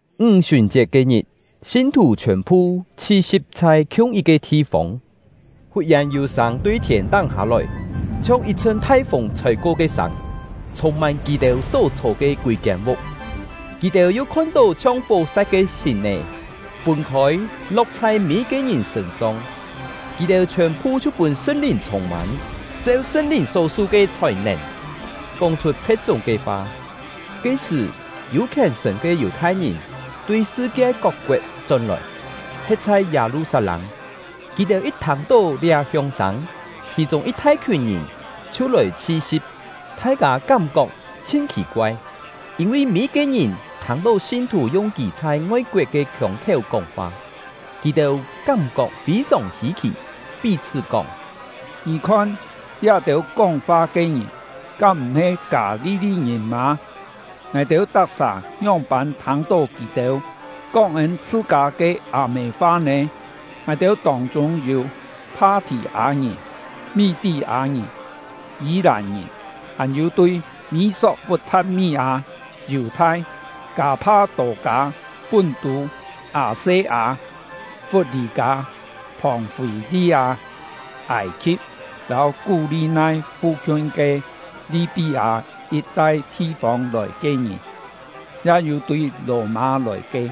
Ńg-sùn-chiet ke-ngit, sin-thù chhiòn-phu chhi-si̍p chhai khiung yit-ke thi-fông. Fut-yèn yû sâng tui thiên-táng hâ-lòi, chhiong yit-chhṳn thai-fûng chhôi-ko ke sâng, chhûng-mân kì-têu só chhô ke kûi-kiên vuk. Kì-têu yu khon-tó chhiong fó-sa̍t ke hìn-è, fûn-khôi, lo̍k chhai mî-yit-ke ngìn sṳ̂n-song. Kì-têu chhiòn-phu chhiu pûn Sṳn-Lìn chhûng-mân, cheu Sṳn-Lìn só-su ke chhòi-nèn kóng-chhut phe̍t-chúng ke fa. Ke-sṳ̀, yû khièn-sṳ̀n ke Yù-thai-ngìn tui sṳ-kie kok-koet chón-lòi, he̍t chhai Yâ-lu-sat-lâng. Kì-têu yit thâng-tó liá hióng-sâng, khì-chûng yit thai-khiùn ngìn chhiu lòi chhi-si̍p. Thai-kâ kám-kok chhin khì-koai, yîn-vi mî-yit-ke ngìn thâng-tó sin-thù yung kì chhai ngoi-koet ke khiông-khiéu kóng-fa. Kì-têu kám-kok fî-sòng hî-khì, pí-chhṳ́ kóng: “Ngì khon, liá-têu kóng-fa ke ngìn kám m̀-he Kâ-li-li-ngìn mâ? Ngài-têu tak-sà ngióng-pân thâng-tó kì-têu kóng ên chhṳ-kâ ke â-mê fa nè? Ngài-têu tông-chûng yû Pha-thì-â-ngìn, Mí-tí-â-ngìn, Yî-làn-ngìn; hàn-yû tui Mî-sok-put-tha̍t-mí-â, Yù-thai, Kâ-pha-tô-kâ, Pún-tû, Â-se-â, Fut-lî-kâ, Phòng-fî-li-â, Âi-khi̍p, lâu Kú-li-nai fu-khiun ke Li-pí-â yit-tai thi-fông lòi ke ngìn; ya yû tui Lò-mâ lòi ke,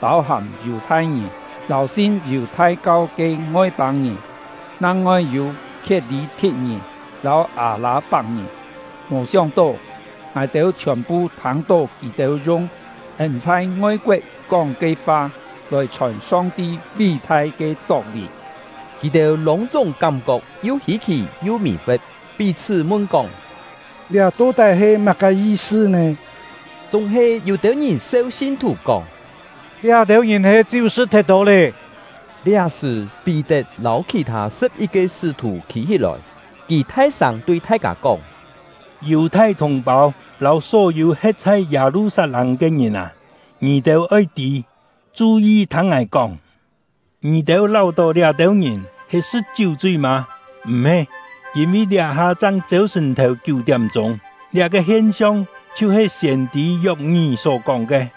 pâu-hàm Yù-thai-ngìn lâu sin Yù-thai-kau ke Ngoi-pâng-ngìn; nang-ngoi yû Khiet-lî-thi̍t-ngìn lâu Â-lâ-pak-ngìn. Mò sióng-tó, ngài-têu chhiòn-phu thâng-tó kì-têu yung ên chhai ngoi-koet kóng ke fa, lòi chhòn Song-ti ví-thai ke chok-vì!” Kì-têu lûng-chúng kám-kok yu hî-khì yu mì-fe̍t, pí-chhṳ́ mun-kóng: “Liá to-tái he má-ke yi-sṳ nè?” Chúng-he, yû-têu ngìn seu sin-thù kóng: “Liá-têu ngìn he chiú sṳ̍t thet tô lé!” Liá-sṳ̀, Pí-tet lâu khì-thâ sṳ̍p-yit-ke sṳ́-thù khî-hí-lòi. Kì thai-sâng tui thai-kâ kóng: “Yù-thai thùng-pâu lâu só-yû he̍t chhai Yâ-lu-sat-lâng ke ngìn â, ngì-têu oi tî, chu-yi thâng ngài kóng. Ngì-têu láu-tó liá-têu ngìn he sṳ̍t chiú-chui mâ? M̀-he, yîn-vi liá-ha chang chêu-sṳ̀n-thèu kiú-tiám-chûng. Liá-ke hien-siong chhiu-he siên-tî Yok-ngí só-kóng ke: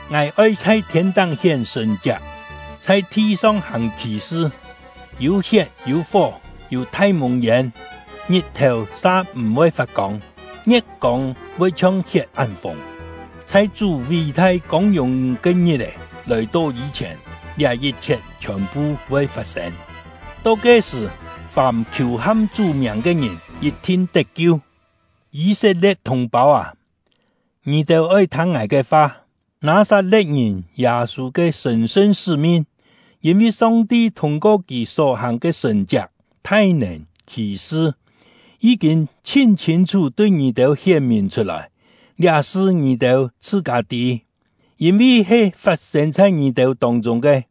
Ngài oi chhai thiên-táng hién sṳ̀n-chiak, chhai thi-song hàng khì-sṳ; yû hiet, yû fó, yû thai mùng-yên; ngit-thèu sa m̀-voi fat-kông; ngie̍t-kông voi chhiong hiet án-fùng; chhai Chú ví-thai kông-yùng ke ngit-è lòi-to yî-chhièn, liá yit-chhiet chhiòn-phu voi fat-sên. To ke-sṳ̀, fàm khiù-ham Chú miàng ke ngìn yit-thin tet-kiu. “Yî-set-lie̍t thùng-pâu â, ngì-têu oi thâng ngài ke fa. Nâ-sat-le̍t-ngìn Yâ-sû ke sṳ̀n-sṳn sṳ́-min, yîn-vi Song-ti thûng-ko kì só-hàng ke sṳ̀n-chiak, thai-nèn, khì-sṳ, yí-kîn chhin chhîn-chhú tui ngì-têu hién-mìn chhut-lòi. Liá-sṳ ngì-têu chhṳ-kâ tî, yîn-vi he fat-sên chhai ngì-têu tông-chûng ke.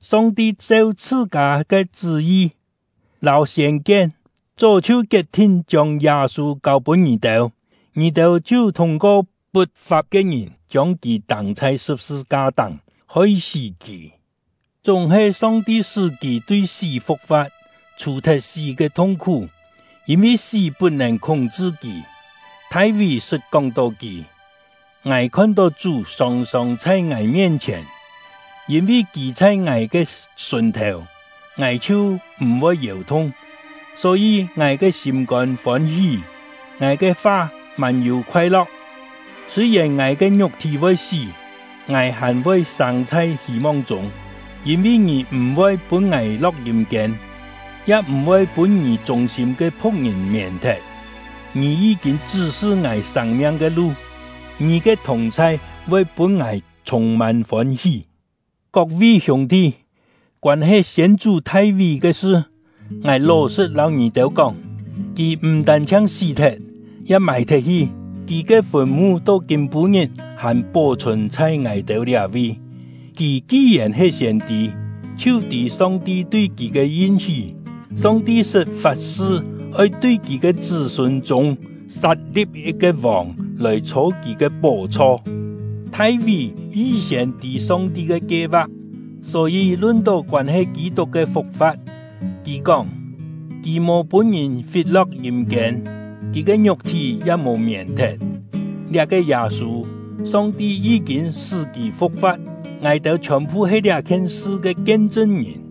Song-ti cheu chhṳ-kâ ke chṳ́-yi lâu siên-kien, chó chhiu kiet-thin chiông Yâ-sû kâu-pûn ngì-têu; ngì-têu chhiu thûng-ko put-fap ke ngìn chiông kì tâng chhai sṳ̍p-sṳ-ka-táng, hoi-sí kì. Chúng-he Song-ti sṳ́ kì tui sí fu̍k-fa̍t, chhù-thet sí ke thung-khú, yîn-vi sí put-nèn khúng-chṳ kì. Thai-ví sṳt kóng-tó kì: Ngài khon-tó Chú sòng-sòng chhai ngài mien-chhièn; yîn-vi Kì chhai ngài ke sùn-thèu, ngài chhiu m̀-voi yèu-thung. Só-yî, ngài ke sîm-kôn fôn-hí, ngài ke fa mân-yû khoai-lo̍k. Sûi-yèn ngài ke ngiuk-thí voi sí, ngài hàn-voi sâng chhai hî-mong chûng. Yîn-vi Ngì m̀-voi pûn ngài lo̍k yîm-kiên, ya m̀-voi pûn Ngì chûng-sîm ke phu̍k-ngìn mièn-thet. Ngì yí-kîn chṳ́-sṳ ngài sâng-miang ke lu; Ngì ke thùng-chhai voi pûn ngài chhûng-mân fôn-hí. “Kok-vi hiûng-thi, koân-he siên-chú Thai-ví ke sṳ, ngài ló-sṳ̍t lâu ngì-têu kóng. Kì m̀ tân-chhiang sí-thet, ya mài-thet-hi; kì ke fùn-mu to kîm-pû-ngit hàn pó-chhùn chhai ngài-têu liá-vi. Kì ki-yèn he siên-tî, chhiu tî Song-ti tui kì ke yin-hí: Song-ti sṳt fat-sṳ oi tui kì ke chṳ́-sûn chûng sat-li̍p yit-ke vòng lòi chhô kì ke pó-chho. Thai-ví yi-siên tî Song-ti ke kie-va̍k, só-yî lun-tó koân-he Kî-tuk ke fu̍k-fa̍t, kì kóng: Kì mò pûn-ngìn fit-lo̍k yîm-kiên; kì ke ngiuk-thí ya mò mièn-thet. Liá-ke Yâ-sû, Song-ti yí-kîn sṳ́ kì fu̍k-fa̍t; ngài-têu chhiòn-phu he liá-khien sṳ ke kien-chṳn-ngìn.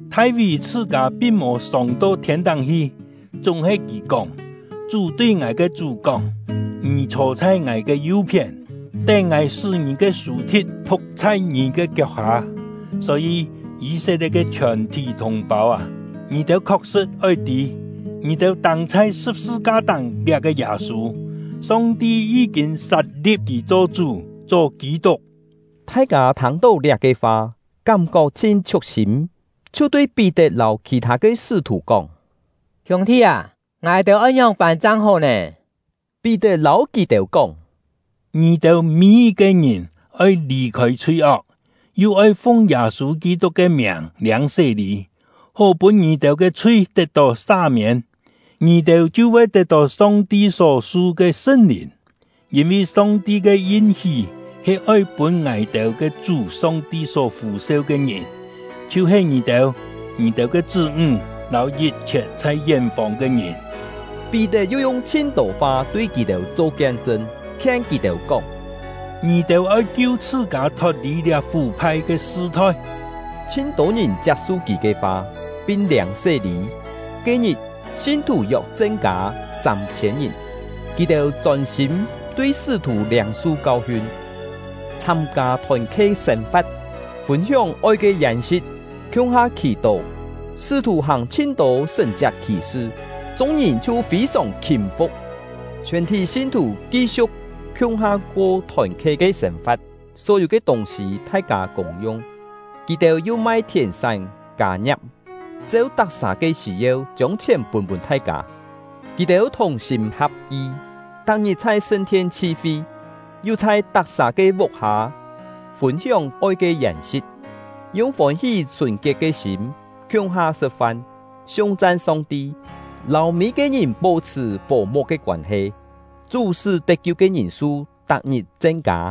Thai-ví chhṳ-kâ pin mò sông-to thiên-táng hi, chúng-he kì kóng: Chú tui ngài ke Chú kóng: Ngì chhô chhai Ngài ke yu-phién, tén Ngài sṳ́ ngì ke sù-thi̍t phu̍k chhai ngì ke kiok-hâ. “Só-yî, Yî-set-lie̍t ke chhiòn-thí thùng-pâu â, ngì-têu khok-sṳ̍t oi tî, ngì-têu tâng chhai sṳ̍p-sṳ-ka-táng liá-ke Yâ-sû, Song-ti yí-kîn sat-li̍p kì cho Chú, cho Kî-tuk!” Thai-kâ thâng-tó liá-ke fa, kám-kok chhin chhiuk-sîm, chhiu tui Pí-tet lâu khì-thâ ke sṳ́-thù kóng: “Hiûng-thi â, ngài-têu oi ngióng-pân chang hó nè?” Pí-tet lâu kì-têu kóng: “Ngì-têu mî-yit-ke ngìn oi lì-khôi chhui-ok, yu oi fung Yâ-sû Kî-tuk ke miàng liâng sé-lî, hó pûn ngì-têu ke chhui tet-tó sa-miên, ngì-têu chhiu voi tet-tó Song-ti só-su ke Sṳn-Lìn. Yîn-vi Song-ti ke yin-hí he oi pûn ngài-têu ke Chú Song-ti só fû-seu ke ngìn, chhiu-he ngì-têu, ngì-têu ke chṳ́-ńg, lâu yit-chhiet chhai yén-fông ke ngìn.” Pí-tet yu yung chhin-tô fa tui kì-têu cho kien-chṳn, khien kì-têu kóng: “Ngì-têu oi kiu chhṳ-kâ thot-lì liá fú-phai ke sṳ-thoi!” Chhin-tô ngìn chiap-su kì ke fa, pin liâng sé-lî; ke-ngit, sin-thù yok chen-kâ sâm-chhiên ngìn. Kì-têu chôn-sîm tui sṳ́-thù liâng-su kau-hiun, chhâm-kâ thòn-khe sên-fa̍t, fûn-hióng oi ke yèn-si̍t, khiung-ha khì-tó. Sṳ́-thù hàng chhin-tô sṳ̀n-chiak khì-sṳ; chung-ngìn chhiu fî-sòng khîm-fu̍k. Chhiòn-thí sin-thù ki-siu̍k khiung-ha ko thòn-khe ke sên-fa̍t, só-yû ke tûng-sî thai-kâ kûng-yung. Kì-têu yu mai thièn-sán kâ-ngia̍p, cheu tak-sà ke sî-yeu chiông chhièn pûn-pûn thai-kâ. Kì-têu thùng-sîm ha̍p-yi, tak-ngit chhai sṳn-thien chhi-fi, yu chhai tak-sà ke vuk-hâ fûn-hióng oi ke yèn-si̍t, yung fôn-hí sùn-kiet ke sîm khiung-ha sṳ̍t-fan, siung-chan Song-ti, lâu mî-yit-ke ngìn pó-chhṳ̀ fò-mu̍k ke koân-he. Chú sṳ́ tet-kiu ke ngìn-su tak-ngit chen-kâ.